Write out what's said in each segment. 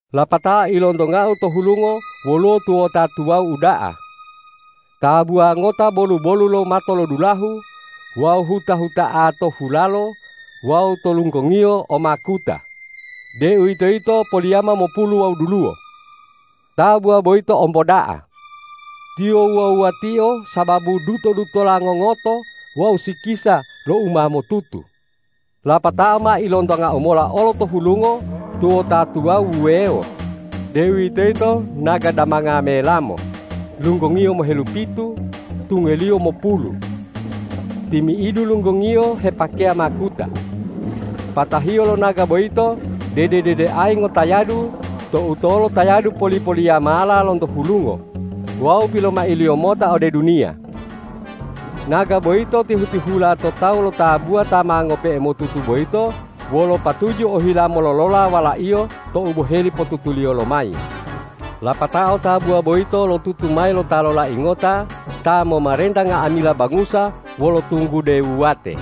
Lapatao ilontongau to hulungo woluwo tuwota tuwawu uda'a: Tabuwa ngota bolu-bolu lo matolodulahu, wawu huta-huta'a to hulalo wawu to lunggongiyo o makuta, deuwitoyito poliyama mopulu wawu duluwo. Tabuwa boyito omboda'a. Tiyo wuwa-wuatio sababu duto-dutola ngongoto wawu sikisa lo u ma motutu. Lapatao ma ilontongau mola olo to hulungo tuwota tuwawu wuwewo, deuwitoyito naga damanga melamo, lunggongiyo mohelupitu, tungeliyo mopulu. Timi'idu lunggongiyo hepakeya makuta. Patahiyo lo naga boyito dede-dedeayi ngotayadu to utolo tayadu poli-poliyamala lonto hulungo wawu pilomailiyo mota ode duniya. Naga boyito tihu-tihula to talu lo tabuwa ta ma ngope'e motutu boyito wolo patuju ohila mololola Walaiyo tou boheli potutuliyo lomayi. Lapatao tabuwa boyito lotutu mayi lo Ta lolai ngota ta momarenta nga'amila bangusa wolo tunggude wuwate.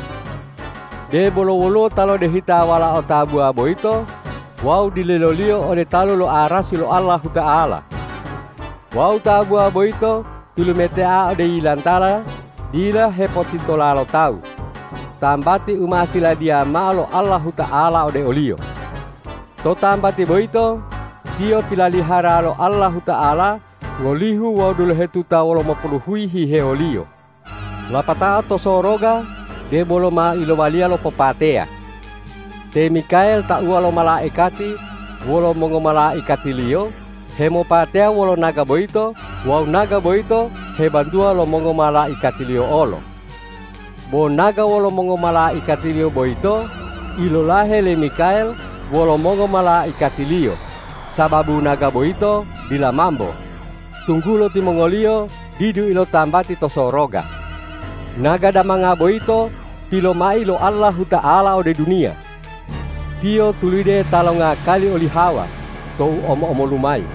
Debolo woluwo ta lodehita Walao tabuwa boyito wawu dilelo-Liyo ode talu lo arasi lo Allahuta'ala. Wawu tabuwa boyito tilumetea ode yilantala dila hepotitola lo tawu, tambati u ma siladiya mao lo Allahuta'ala ode oliyo. To tambati boyito tiyo pilalihara lo Allahuta'ala ngolihu wawu dulohetuta wolomopuluhuyi hihewoliyo. Lapatao to soroga debolo ma ilowaliya lopopateya. Te Mikael tauwa lo malaikati wolo mongomalaikatiliyo hemopateya wolo naga boyito wawu naga boyito hebantuwa lo mongomalaikatiliyo olo. Bo naga wolo mongomalaikatiliyo boyito ilolahe le Mikael wolo mongomalaikatiliyo, sababu naga boyito dila mambo, tunggulo timongoliyo didu ilotambati to soroga. Naga damanga boyito pilomai lo Allahuta'ala ode duniya. Tiyo tulide ta longakali oli Hawa tou omo-omolu mayi,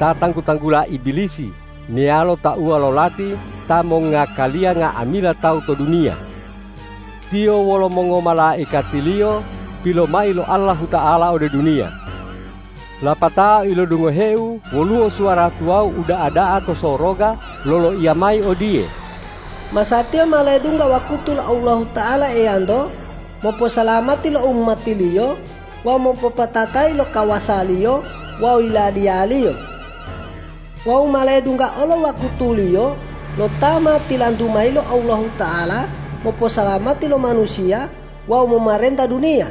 ta tanggu-tanggula Ibilisi meyalo tauwa lo lati ta mongngakaliya nga'amila tawu to duniya. Tiyo wolo mongomalaikatiliyo pilomai lo Allahuta'ala ode duniya. Lapatao ilodungoheu woluwo suwara tuwawu uda'a da'a to soroga loloiya mayi odiye,”Masatiya ma ledungga wakutu lo Allahuta'ala Eyanto moposalamati lo umati-Liyo wawu mopopatatayi lo kawasa-Liyo wawu Yiladiya-Liyo. Wawu ma ledungga olo wakutu-Liyo lo Ta ma tilantu mayi lo Allahuta'ala moposalamati lo manusiya wawu momarenta duniya.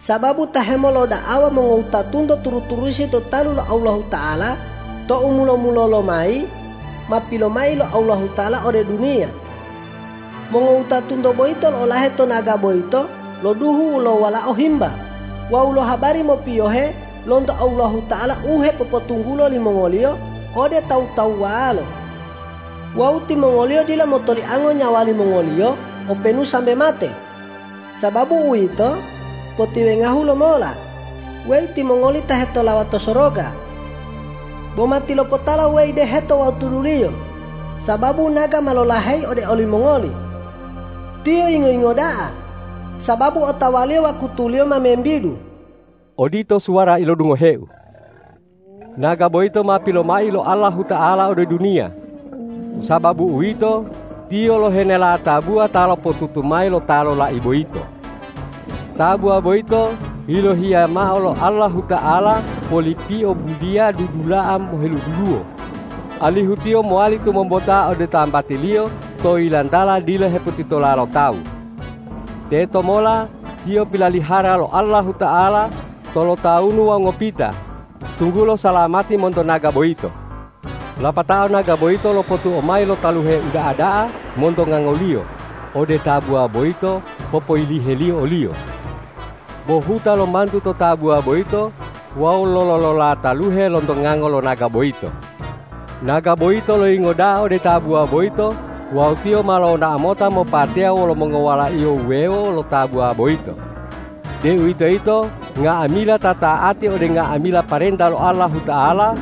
Sababu ta hemoloda'awa mongowutatunto turu-turusi to talu lo Allahuta'ala tou mulo-mulolo mayi, ma pilomai lo Allahuta'ala ode duniya. Mongowutatunto boyito lo'olahe to naga boyito lo duhu lo Walao Himba wawu lo habari mopiyohe lonto Allahuta'ala u hepopotunggulo limongoliyo ode tawu-tawuwalo. Wawu timongoliyo dila motoliango nyawa limongoliyo, openu sambe mate. Sababu uwito, potiwengahu lomola, weyi timongoli ta hetolawa to soroga. Bo matilopotala, weyi deheto wawu tuduliyo, sababu naga ma lolaheyi ode olimongoli. Tiyo yingo-yingo da'a, sababu otawaliyo wakutuliyo ma membidu.” Odito suwara ilodungoheu. Naga boyito ma pilomai lo Allahuta'ala ode duniya. Sababu uwito, tiyo lohenela tabuwa ta lopotutu mayi lo Ta lolai boyito. Tabuwa boyito yilohiya mao lo Allahuta'ala polipio buliya dudula'a moheduluwo, alihu tiyo mowali tumombota ode tambatiliyo to yilantala dila hepotitola lo tawu. Teto mola tiyo pilalihara lo Allahuta'ala tolotawunu wawu ngopita, tunggulo salamati monto naga boyito. Lapatao naga boyito lopotuo mayi lo taluhe uda'a da'a monto ngangoliyo ode tabuwa boyito popoyiliheliyo oliyo. Bo huta lomantu to tabuwa boyito wawu lololola taluhe lonto ngango lo naga boyito. Naga boyito loyingo da'a ode tabuwa boyito wawu tiyo ma lonao mota mopateya wolo mongowalaiyo wuwewo lo tabuwa boyito, deuwitoyito nga'amila ta ta'ati ode nga'amila parenta lo Allahuta'ala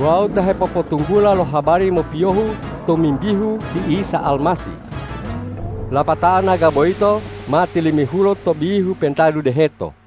wawu ta hepopotunggula lo habari mopiyohu tomimbihu ti Isa Almasih. Lapatao naga boyito ma tilimihulo to bihu pentadu deheto.